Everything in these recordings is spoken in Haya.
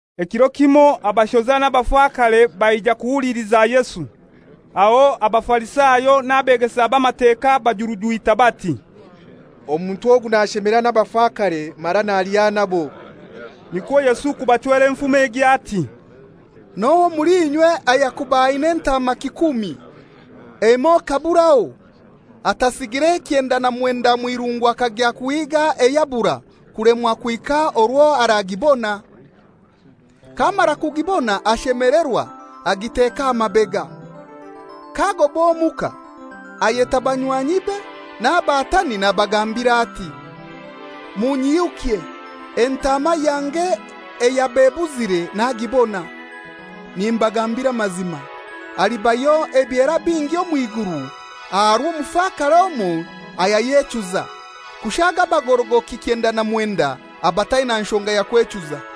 Ekiro kimoi abashoza n'abafakare baija kuhuliliza Yesu. Aho Abafarisayo n'abeegesa b'Amateka bajurujwita bati, «Omuntu ogu nashemera n'abafakare mara nalya nabo.» Nikwo Yesu kubachwera enfumo egi, ati, «N'ohai omuli inywe ayakuba aina entaama kikumi, emoi ekaburaho, atasigire ekyenda na mwenda omw'irungu akagya kuhiiga eyabura kulemwa kuhika orwo aragibona? K'amara kugibona ashemelerwa agiteka aha mabega. K'agoba omuka ayeta banywanyibe n'abatani nabagambira ati, ‹Munyihukye, entaama yange eyaba ebuzire nagibona.› Nimbagambira amazima, alibayo ebyera bingi omw'iguru aha rw'omufakare omoi ayayechuza, kushaaga abagorogoki ekyenda na mwenda abataina nshonga ya kwechuza.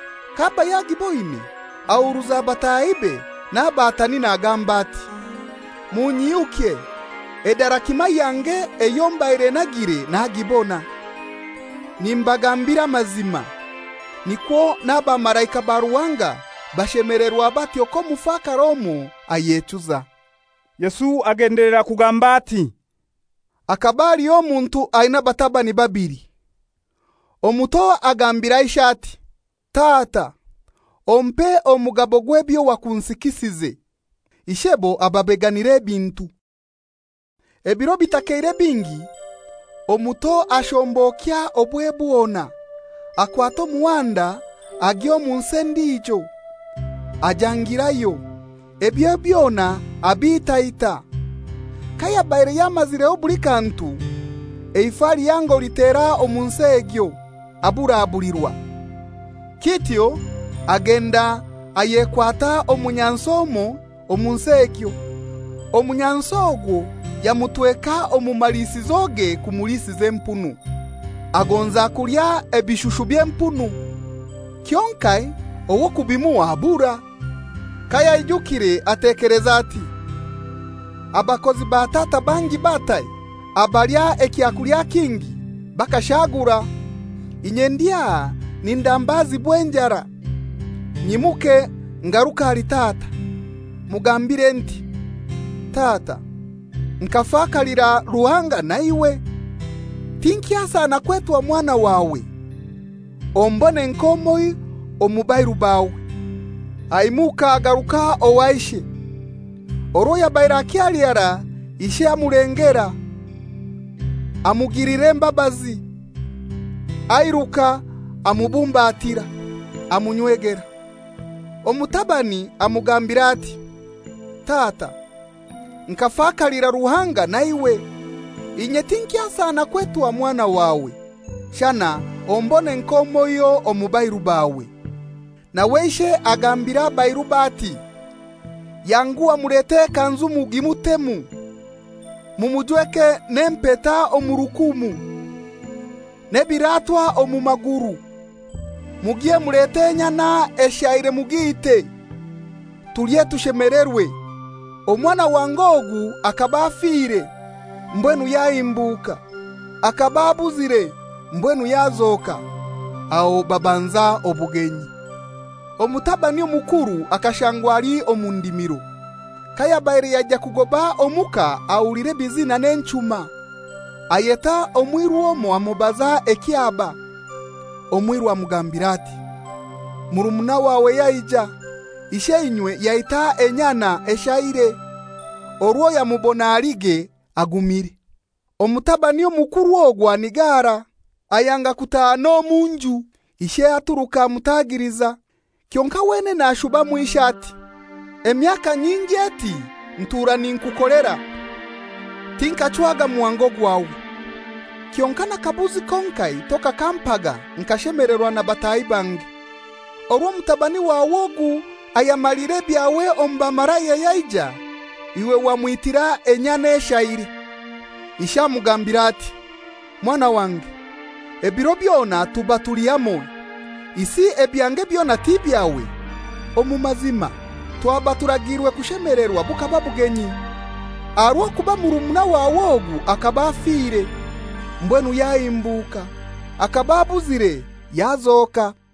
K'aba yagiboine ahuruza batahibe n'abatani nagamba ati, ‹Munyihukye, edarakima yange eyo mbaire nagire nagibona.› Nimbagambira amazima, nikwo n'abamalaika ba Ruhanga bashemelerwa batyo k'omufakare omoi ayechuza.» Yesu agendelera kugamba ati, «Hakaba haliho omuntu aina abatabani babili. Omuto agambira ishe ati, ‹Tata, ompe omugabo gw'ebyo wakunsikisize.› Ishebo ababeganira ebintu. Ebiro bitakeire bingi, omuto ashombokya obwe bwona, akwata omuhanda agya omu nsi endijo, ajangirayo, ebye byona abitaita. Kayabaire yamazireho buli kantu, eifa lihango litera omu nsi egyo, aburabulirwa. Kityo agenda ayekwata omunyansi omoi omu nsi egyo, omunyansi ogwo yamutweka omu maliisizoge kumulisiza empunu. Agonza kulya ebishushu by'empunu, kyonkai ow'okubimuha abura. Kayaijukire atekeleza ati, ‹Abakozi ba tata bangi batai abalya ekyakulya kingi bakashaagura? Inye ndi aha nindambazibwa enjara!› Nyimuke ngaruke ahali tata, mugambire nti, ‹Tata, nkafakalira Ruhanga na iwe. Tinkyasana kwetwa mwana wawe, ombone nk'omoiho omu bairu bawe.› Aimuka agaruka owa ishe. Orwo yabaire akyali harai, ishe amulengera, amugilira embabazi, airuka amubumbatira, amunywegera. Omutabani amugambira ati, ‹Tata, nkafakalira Ruhanga na iwe. Inye tinkyasana kwetwa mwana wawe, shana ombone nk'omoiho omu bairu bawe.› Nawe ishe agambira abairube ati, ‹Yanguha mulete ekanzu mugimutemu. Mumujweke n'empeta omu rukumu, n'ebiratwa omu maguru. Mugye mulete enyana eshaire mugiite, tulye tushemelerwe. Omwana wange ogu akaba afire, mbwenu yahimbuka. Akaba abuzire, mbwenu yazoka.›» Aho babanza obugenyi. «Omutabani omukuru akashangwa ali omu ndimiro. Kayabaire yaija kugoba omuka ahulira ebizina n'enchuma. Ayeta omwiru omoi amubaza ekyaba. Omwiru amugambira ati, ‹Murumuna wawe yaija, isheinywe yaita enyana eshaire, orwo yamubona alige agumire.› Omutabani omukuru ogwo anigara, ayanga kutaaha n'omu nju. Ishe aturuka amutagiliza, kyonkai wenene ashubamu ishe ati, ‹Emyaka nyingi eti ntura ninkukolera, tinkachwaga muhango gwawe. Kyonkai n'akabuzi konkai tokakampaga nkashemelerwa na bataahi bange. Orwo mutabani wawe ogu ayamalire ebyawe omu bamalaya yaija, iwe wamwitira enyana eshaire!› Ishe amugambira ati, ‹Mwana wange, ebiro byona tuba tuli hamoi, isi ebyange byona ti byawe? Omu mazima twaba turagiirwe kushemelerwa bukaba bugenyi, aha rw'okuba murumuna wawe ogu akaba afire, mbwenu yahimbuka; akaba abuzire, yazoka.›»